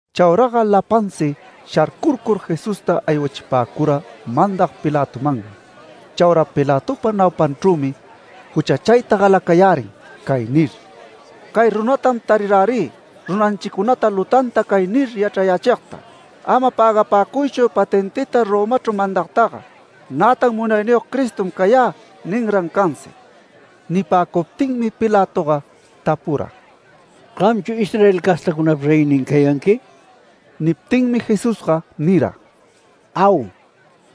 Chauraga lapansi sharcurcur, Jesusta aywachipäcura mandag Pilatomanmi. Chaura Pilatopa naupanchrümi juchachayta galacayärin cay nir: “Cay runatam tarirärï runanchicunata lutanta cay nir yachrayächigta: ‘Ama pägapäcuychu patentita Romachru mandagtaga’. Nätan ‘Munayniyog Cristom cayä’ ninran cansi”. Nipäcuptinmi Pilatoga tapura: “¿Gamchu Israel castacunapa reynin cayanqui?” Niptinmi Jesusga nira: “Au.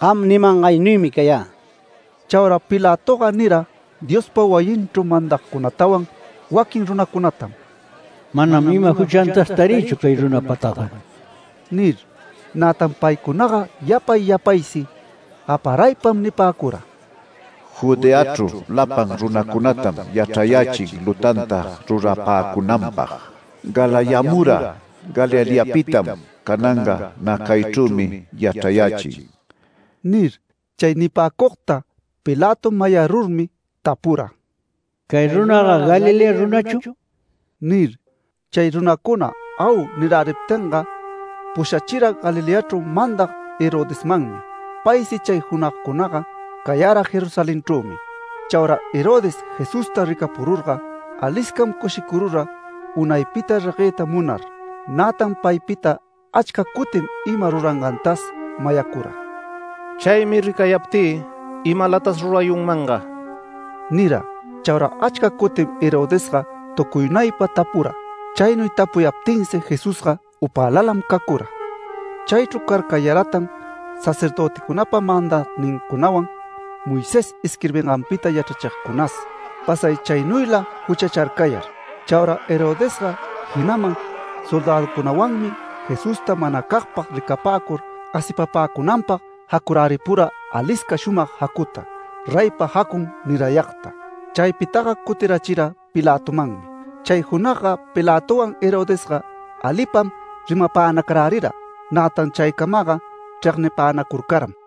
Gam nimangaynuymi cayä”. Chaura Pilatoga nira Diospa wayinchru mandagcunatawan waquin runacunatam: “Manam ima juchantas tarïchu cay runapataga” nir. Nätan paycunaga yapay yapaysi gaparaypam nipäcura: “Judeachru lapan runacunatam yachrayächin lutanta rurapäcunanpag. Galayamura Galileapitam, cananga nä caychrümi yachrayächin” nir. Chay nipäcugta Pilato mayarurmi tapura: “¿Cay runaga Galilea runachu?” nir. Chay runacuna “Au” niräriptinga, pusharachira Galileachru mandag Herodesmanmi. Paysi chay junagcunaga cayara Jerusalenchrümi. Chaura Herodes Jesusta ricapururga, aliscam cushicurura unaypita regueyta munar. Nätan paypita achca cutim ima rurangantas mayacura, “Chaymi ricayaptï imalatas rurayunmanga” nira. Chaura achca cutim Herodesga tucuynaypa tapura. Chaynuy tapuyaptinsi Jesusga upälalam cacura. Chaychru carcayaratan sacerdöticunapa mandagnincunawan, Moisés isquirbinganpita yachrachigcunas, pasay chaynuyla juchacharcayar. Chaura Herodesga, jinaman soldäduncunawanmi Jesusta manacagpag ricapäcur asipapäcunanpag jacuräripura alisca shumag jacuta, reypa jacun nirayagta. Chaypitaga cutirachira Pilatomanmi. Chay junagga Pilatowan Herodesga alipam rimapänacarärira. Nätan chaycamaga chregnipänacurcaram.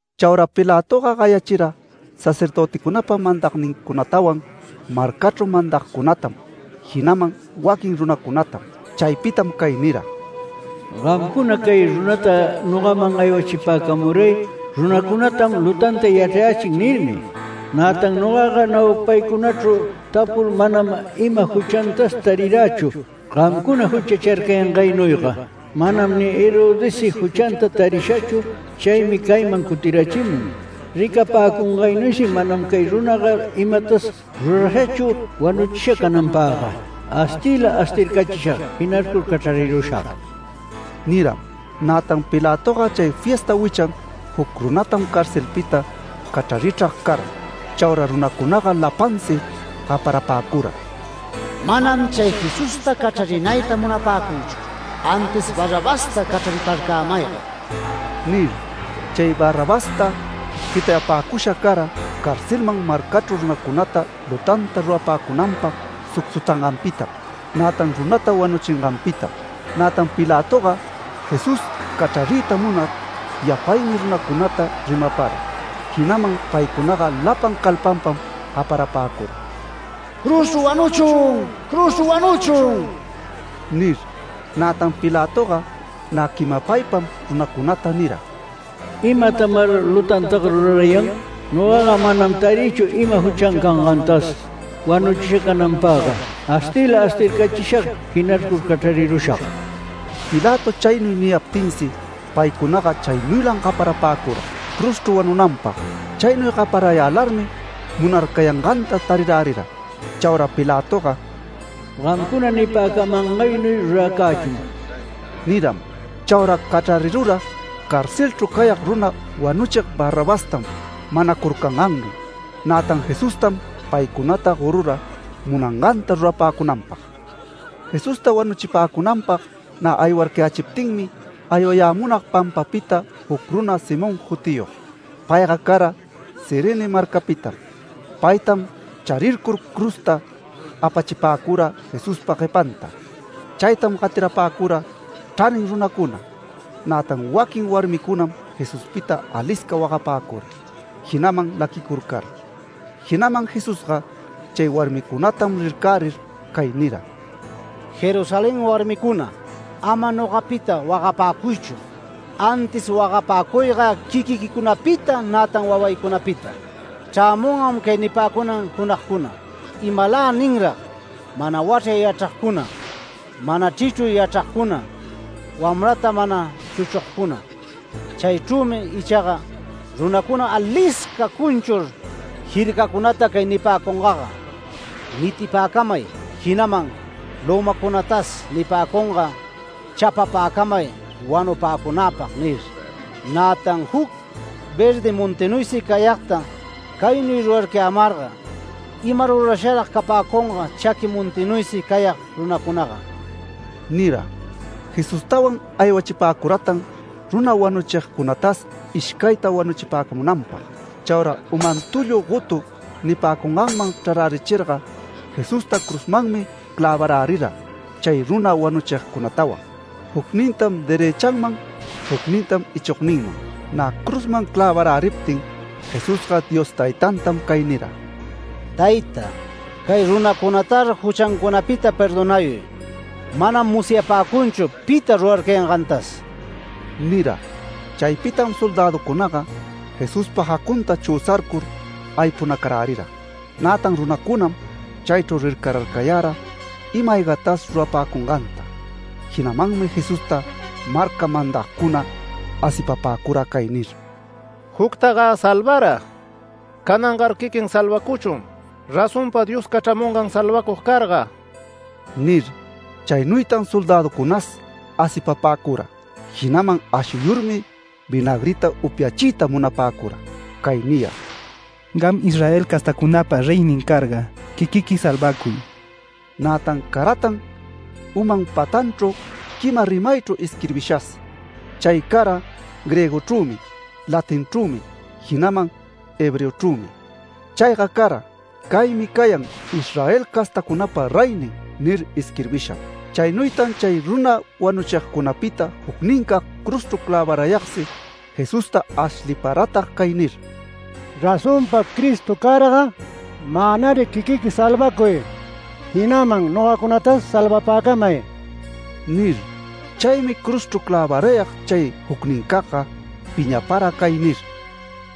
Chaura Pilatoga gayachira sacerdöticunapa mandagnincunatawan, marcachru mandagcunatam, jinaman waquin runacunatam. Chaypitam cay nira: “Gamcuna cay runata nogaman aywachipäcamuray. ‘Runacunatam lutanta yachrayächin’ nirmi. Nätan nogaga naupaycunachru tapur manam ima juchantas tarirächu gamcuna juchacharcayangaynuyga. Manam ni Herodessi juchanta tarishachu. Chaymi cayman cutirachimun. Ricapäcungaynuysi manam cay runaga imatas rurashachu wanuchisha cananpagga. Astiyla astircachishag, jinarcur cachrarirushag” niram. [Nätan Pilatoga chay fiesta wichan juc runatam carcelpita cachrarichrag cara.] Chaura runacunaga lapansi gaparapäcura: “¡Manam chay Jesusta cachrarinayta munapäcüchu! ¡Antis Barrabasta cachrariparcämayga!” nir. Chay Barrabasta jitayapäcusha cara carcelman marcachru runacunata lutanta rurapäcunanpag sucsutanganpitam, nätan runata wanuchinganpitam. Nätan Pilatoga Jesús cachrariyta munar, yapaymi runacunata rimapara. Jinaman paycunaga lapan calpanpam gaparapäcura: “¡Cruzchru wanuchun! ¡Cruzchru wanuchun!” nir. Nätan Pilatoga nä quimapaypam runacunata nira: “¿Imatamar lutantaga rurarayan? Nogaga manam tarïchu ima juchan cangantas wanuchisha cananpagga. Astiyla astircachishag, jinarcur cachrarirushag”. Pilato chaynuy niyaptinsi paycunaga chaynuylam gaparapäcura, cruzchru wanunanpag. Chaynuy gaparayälarmi munarcayanganta tarirärira. Chaura Pilatoga “Gamcuna nipäcamangannuy ruracächun” niram. Chaura cachrarirura carcelchru cayag runa wanuchig Barrabastam manacurcangannuy. Nätan Jesustam paycunata gorura munanganta rurapäcunanpag. Jesusta wanuchipäcunanpag nä aywarcayächiptinmi, aywayämunag pampapita juc runa Simón jutiyog. Payga cara Cirene marcapitam. Paytam charircur cruzta apachipäcura Jesuspa guepanta. Chaytam gatirapäcura chranin runacuna. Nätan waquin warmicunam Jesuspita alisca wagapäcura, jinaman laquicurcara. Jinaman Jesusga chay warmicunatam rircärir cay nira: “Jerusalén warmicuna, ama nogapita wagapäcuychu, antis wagapäcuyga quiquiquicunapita nätan wawaycunapita. Chrämungam cay nipäcunan junagcuna: ‘Imaläninrag mana wachray yachragcuna, mana chrichruy yachragcuna, wamrata mana chuchugcuna’. Chaychrümi ichaga runacuna alisca cunchur jircacunata cay nipäcungaga: ‘Nitipäcamay’. Jinaman lömacunatas nipäcunga: ‘Chapapäcamay wanupäcunäpag’ nir. Nätan juc verdi montinuysi cayagta caynuy rurarcayämarga, ima rurasharag capäcunga chaqui montinuysi cayag runacunaga” nira. Jesustawan aywachipäcuratan runa wanuchigcunatas ishcayta wanuchipäcamunanpag. Chaura ‘Uman tullu gotu’ nipäcunganman chrarärichirga Jesusta cruzmanmi clävarärira chay runa wanuchigcunatawan, jucnintam derëchanman, jucninta ichogninman. Nä cruzman clävaräriptin Jesusga Dios Taytantam cay nira: “Tayta, cay runacunatar juchancunapita perdonayuy. Manam musyapäcunchu pita rurarcayangantas” nira. Chaypitam soldäducunaga Jesuspa jacunta chüsarcur aypunacarärira. Nätan runacunam chaychru rircararcayara ima-aygatas rurapäcunganta. Jinamanmi Jesusta marca mandagcuna asipapäcura cay nir: “Juctagä salvara. Canangar quiquin salvacuchun razonpa Dios cachramungan salvacug carga” nir. Chaynuytan soldäducunas asipapäcura, jinaman ashuyurmi vinagrita upyachiyta munapäcura, cay niyar: “Gam Israel castacunapa reynin carga, quiquiqui salvacuy”. Nätan caratan uman patanchru quima rimaychru, isquirbishas. Chay cara griegochrümi, latinchrümi, jinaman hebreochrümi. Chayga cara: “CAYMI CAYAN ISRAEL CASTACUNAPA REYNIN” nir isquirbisham. Chaynuytan chay runa wanuchigcunapita jucnincag cruzchru clävarayagsi Jesusta ashliparatag cay nir: “Razonpa Cristo carga, mänar quiquiqui salvacuy, jinaman nogacunatas salvapäcamay” nir. Chaymi cruzchru clävarayag chay jucnincagga piñapara cay nir: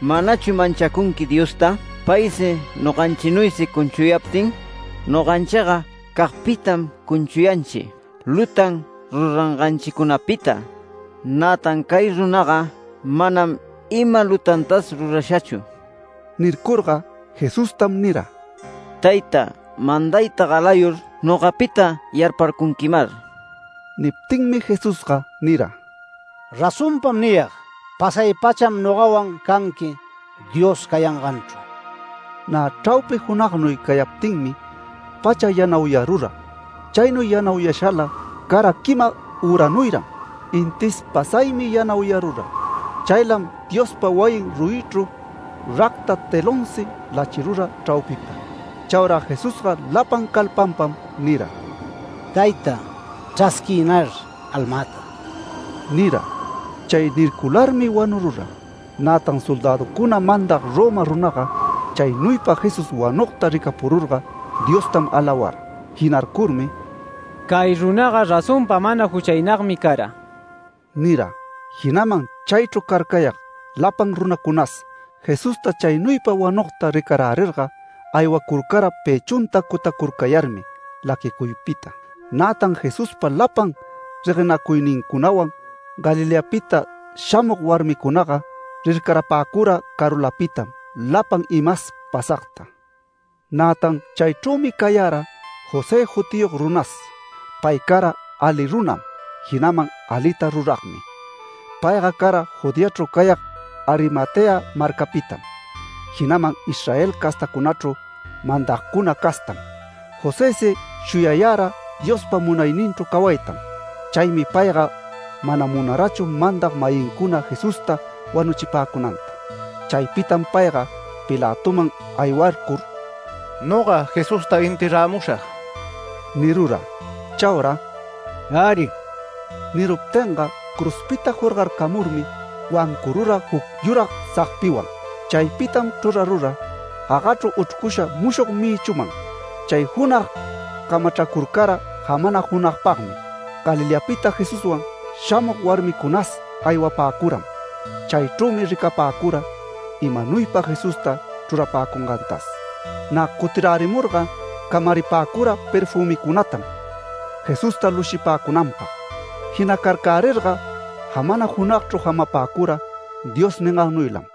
“¿Manachu manchacunqui Diosta, paysi noganchinuysi cunchuyaptin? Noganchiga cagpitam cunchuyanchi lutan ruranganchicunapita, nätan cay runaga manam ima lutantas rurashachu”. Nircurga Jesustam nira: “Tayta, mandayta galayur nogapita yarparcunquimar”. Niptinmi Jesusga nira: “Razonpam niyag: Pasay-pacham nogawan canqui Dios cayanganchru”. Nä chraupi junagnuy cayaptinmi pacha yanauyarura. Chaynuy yanauyashala cara quima üranuyran, intis pasaymi yanauyarura. Chaylam Diospa wayin ruyichru racta telonsi lachirura chraupipa. Chaura Jesusga lapan calpanpam nira: “Tayta, chrasquiynar almäta” nira. Chay nircularmi wanurura. Nätan soldäducuna mandag Roma runaga, chaynuypa Jesús wanugta ricapururga Diostam alawara. Jinarcurmi “Cay runaga razonpa mana juchaynagmi cara” nira. Jinaman chaychru carcayag lapan runacunas Jesusta chaynuypa wanugta ricarärirga, aywacurcara pëchunta cutacurcayarmi laquicuypita. Nätan Jesuspa lapan reguenacuynincunawan Galileapita shamug warmicunaga, rircarapäcura carulapitam lapan imas pasagta. Nätan chaychrümi cayara José jutiyog runas. Pay cara ali runam, jinaman alita ruragmi. Payga cara Judeachru cayag Arimatea marcapitam, jinaman Israel castacunachru mandagcuna castam. Josësi shuyayara Diospa munayninchru cawaytam. Chaymi payga mana munarachu mandag-mayincuna Jesusta wanuchipäcunanta. Chaypitam payga Pilatoman aywarcur “Noga Jesusta enterramushag” nirura. Chaura “Äri” niruptinga cruzpita jorgarcamurmi, wancurura juc yurag sagpiwan. Chaypitam chrurarura gagachru uchrcusha mushog mïchuman. Chay junag camachracurcara jamana junagpagmi. Galileapita Jesuswan shamug warmicunas aywapäcuram. Chaychrümi ricapäcura imaynuypa Jesusta chrurapäcungantas. Nä cutirärimurga camaripäcura perfümicunatam Jesusta lushipäcunanpag. Jinacarcärirga jamana junagchru jamapäcura Dios ningannuylam.